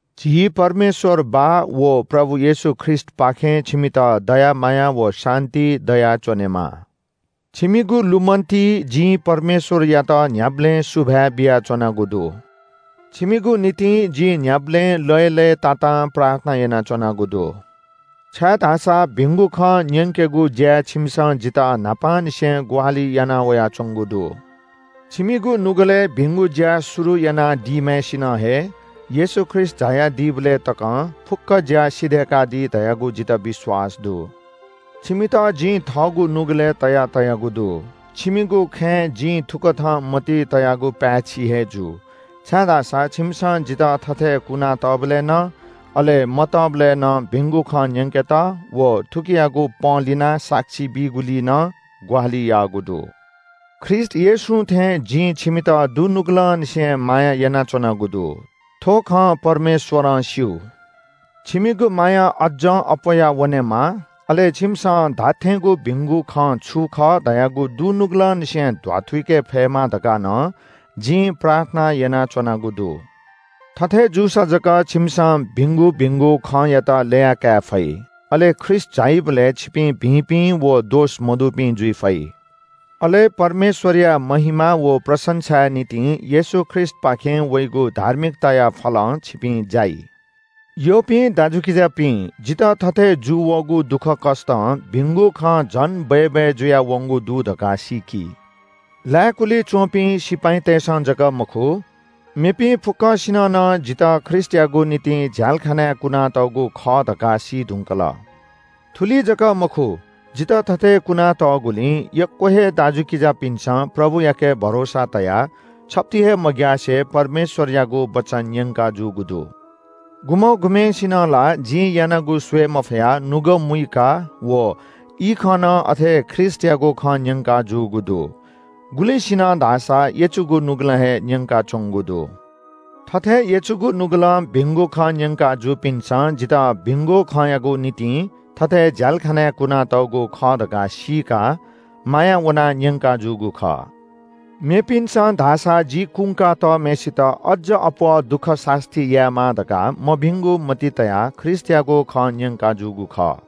झी परमेश्‍वर बाः व प्रभु येशू ख्रीष्‍टपाखें छिमित दया माया व शान्‍ति दयाच्‍वनेमा। छिमिगु लुमन्‍तिइ जिं परमेश्‍वरयात न्‍ह्याबलें सुभाय् बियाच्‍वनागु दु। छिमिगु निंतिं जिं न्‍ह्याबलें लय्‌लय्‌तातां प्रार्थना यानाच्‍वनागु दु। छाय्‌धाःसा भिंगु खँ न्‍यंकेगु ज्‍याय् छिमिसं जितः न्‍हापांनिसें ग्‍वाहालि यानावयाच्‍वंगु दु। छिमिगु नुगलय् भिंगु ज्‍या शुरु यानादीम्‍हय्‌सिनं हे येशू ख्रीष्‍ट झायादीबलय् तकं फुक्‍क ज्‍या सिधय्‌कादी धयागु जितः विश्‍वास दु। छिमित जिं थःगु नुगलय् तया तयागु दु। छिमिगु खँय् जिं थुकथं मतिइ तयागु पाय्‌छि हे जू, छाय्‌धाःसा छिमिसं जितः थथे कुनातःबलय् नं अले मतःबलय् नं भिंगु खँ न्‍यंकेत व थुकियागु पंलिनाः साक्षी बीगुलिइ नं ग्‍वाहालि याःगु दु। ख्रीष्‍ट येशूं थें जिं छिमित दुनुगलंनिसें माया यानाच्‍वनागु दु। थ्‍व खँ परमेश्‍वरं स्‍यू। छिमिगु माया अज्‍जं अप्‍वयावनेमा, अले छिमिसं धात्‍थेंगु भिंगु खँ छु खः धयागु दुनुगलंनिसें ध्‍वाथुइके फयेमा धकाः नं जिं प्रार्थना यानाच्‍वनागु दु। थथे जूसा जक छिमिसं भिंगु भिंगु खँयात ल्‍यया काये फइ। अले ख्रीष्‍ट झाइबलय् छिपिं शुद्धपिं व दोष मदुपिं जुइ फइ। अले परमेश्‍वरया महिमा व प्रशंसाया निंतिं येशू ख्रीष्‍टपाखें वइगु धार्मिकताया फलं छिपिं जाइ। यःपिं दाजुकिजापिं, जितः थथे जूवःगु दुःखकष्‍टं भिंगु खँ झन बय्‌बय् जुयावंगु दु धकाः सीकि। लाय्‌कुलिइ च्‍वंपिं सिपाइँतय्‌सं जक मखु, मेपिं फुक्‍कसिनं नं जितः ख्रीष्‍टयागु निंतिं झ्‍यालखानाय् कुनातःगु खः धकाः सी धुंकल। थुलि जक मखु, जितः थथे कुनातःगुलिं यक्‍व हे दाजुकिजापिन्‍सं प्रभुयाके भरोसा तयाः छप्‍ति हे मग्‍यासे परमेश्‍वरयागु वचन न्‍यंकाजूगु दु। गुम्‍ह गुम्‍हय्‌सिनं ला जिं यानागु स्‍वये मफयाः नुगः मुइकाः व इखं नं अथे ख्रीष्‍टयागु खँ न्‍यंकाजूगु दु। गुलिसिनं धाःसा यचुगु नुगलं हे न्‍यंकाच्‍वंगु दु। थथे यचुगु नुगलं भिंगु खँ न्‍यंका जूपिन्‍सं जितः भिंगु खँयागु निंतिं थथे झ्‍यालखानाय् कुनातःगु खः धकाः सीकाः माया वनाः न्‍यंकाजूगु खः। मेपिन्‍सं धाःसा जि कुंका तःम्‍हय्‌सित अज्‍ज अप्‍वः दुःख सास्‍ती यायेमा धकाः मभिंगु मतिइ तयाः ख्रीष्‍टयागु खँ न्‍यंकाजूगु खः।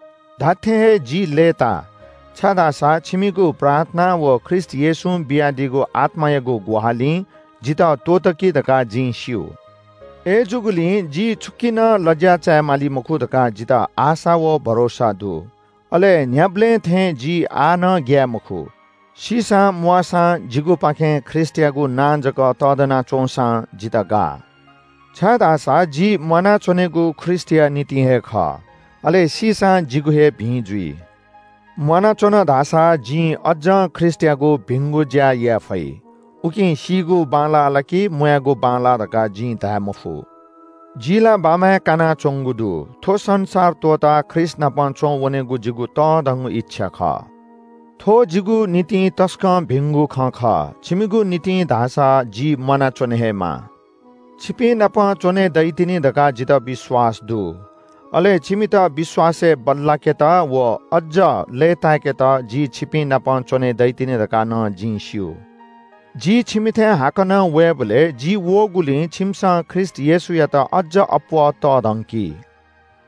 धात्‍थें हे जि लय्‌ताः, छाय्‌धाःसा छिमिगु प्रार्थना व ख्रीष्‍ट येशूं बियादीगु आत्‍मायागु ग्‍वाहालिं जितः त्‍वःतकी धकाः जिं स्‍यू। अय्‌जूगुलिं जि छुकी नं लज्‍या चाये माली मखु धकाः जितः आशा व भरोसा दु। अले न्‍ह्याबलें थें जि आः नं ग्‍याये मखु, सीसां म्‍वाःसां जिगुपाखें ख्रीष्‍टयागु नां जक तःधना च्‍वंसां जितः गाः। छाय्‌धाःसा जि म्‍वानाच्‍वनेगु हे ख्रीष्‍टया निंतिं खः, अले सीसां जिगु हे भिं जुइ। म्‍वानाच्‍वन धाःसा जिं अज्‍जं ख्रीष्‍टयागु भिंगु ज्‍या याये फइ। उकिं सीगु बांलाः ला कि म्‍वायेगु बांलाः धकाः जिं धाये मफु। जि ला बाम्‍हय् कानाच्‍वंगु दु। थ्‍व संसार त्‍वःताः ख्रीष्‍टनाप च्‍वंवनेगु जिगु तःधंगु इच्‍छा खः। थ्‍व जिगु निंतिं तसकं भिंगु खँ खः, छिमिगु निंतिं धाःसा जि म्‍वानाच्‍वने हे माः। छिपिंनाप च्‍वने दइतिनि धकाः जितः विश्‍वास दु। अले छिमित विश्‍वासय् बल्‍लाकेत व अज्‍ज लय्‌ताय्‌केत जि छिपिंनाप च्‍वने दइतिनि धकाः नं जिं स्‍यू। जि छिमिथाय् हाकनं वयेबलय् जि वःगुलिं छिमिसं ख्रीष्‍ट येशूयात अज्‍ज अप्‍वः तःधंकी।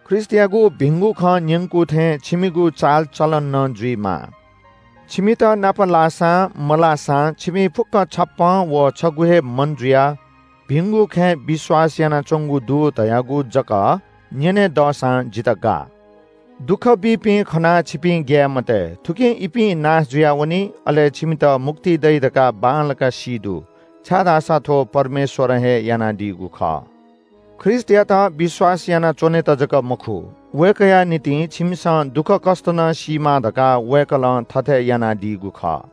ख्रीष्‍टयागु भिंगु खँ न्‍यंकू थें छिमिगु चालचलन नं जुइमाः। छिमित नाप लाःसां, मलाःसां छिपिं फुक्‍कं छप्‍पँ व छगू हे मन जुयाः भिंगु खँय् विश्‍वास यानाच्‍वंगु दु धयागु जक न्‍यने दःसां जितः गाः। दुःख बीपिं खनाः छिपिं ग्‍याये मते। थुकिं इपिं नाश जुयावनी, अले छिमित मुक्ति दइ धकाः बांलाक सी दु, छाय्‌धाःसा थ्‍व परमेश्‍वरं हे यानादीगु खः। ख्रीष्‍टयात विश्‍वास यानाच्‍वनेत जक मखु, वय्‌कःया निंतिं छिमिसं दुःखकष्‍ट नं सीमाः धकाः वय्‌कलं थथे यानादीगु खः।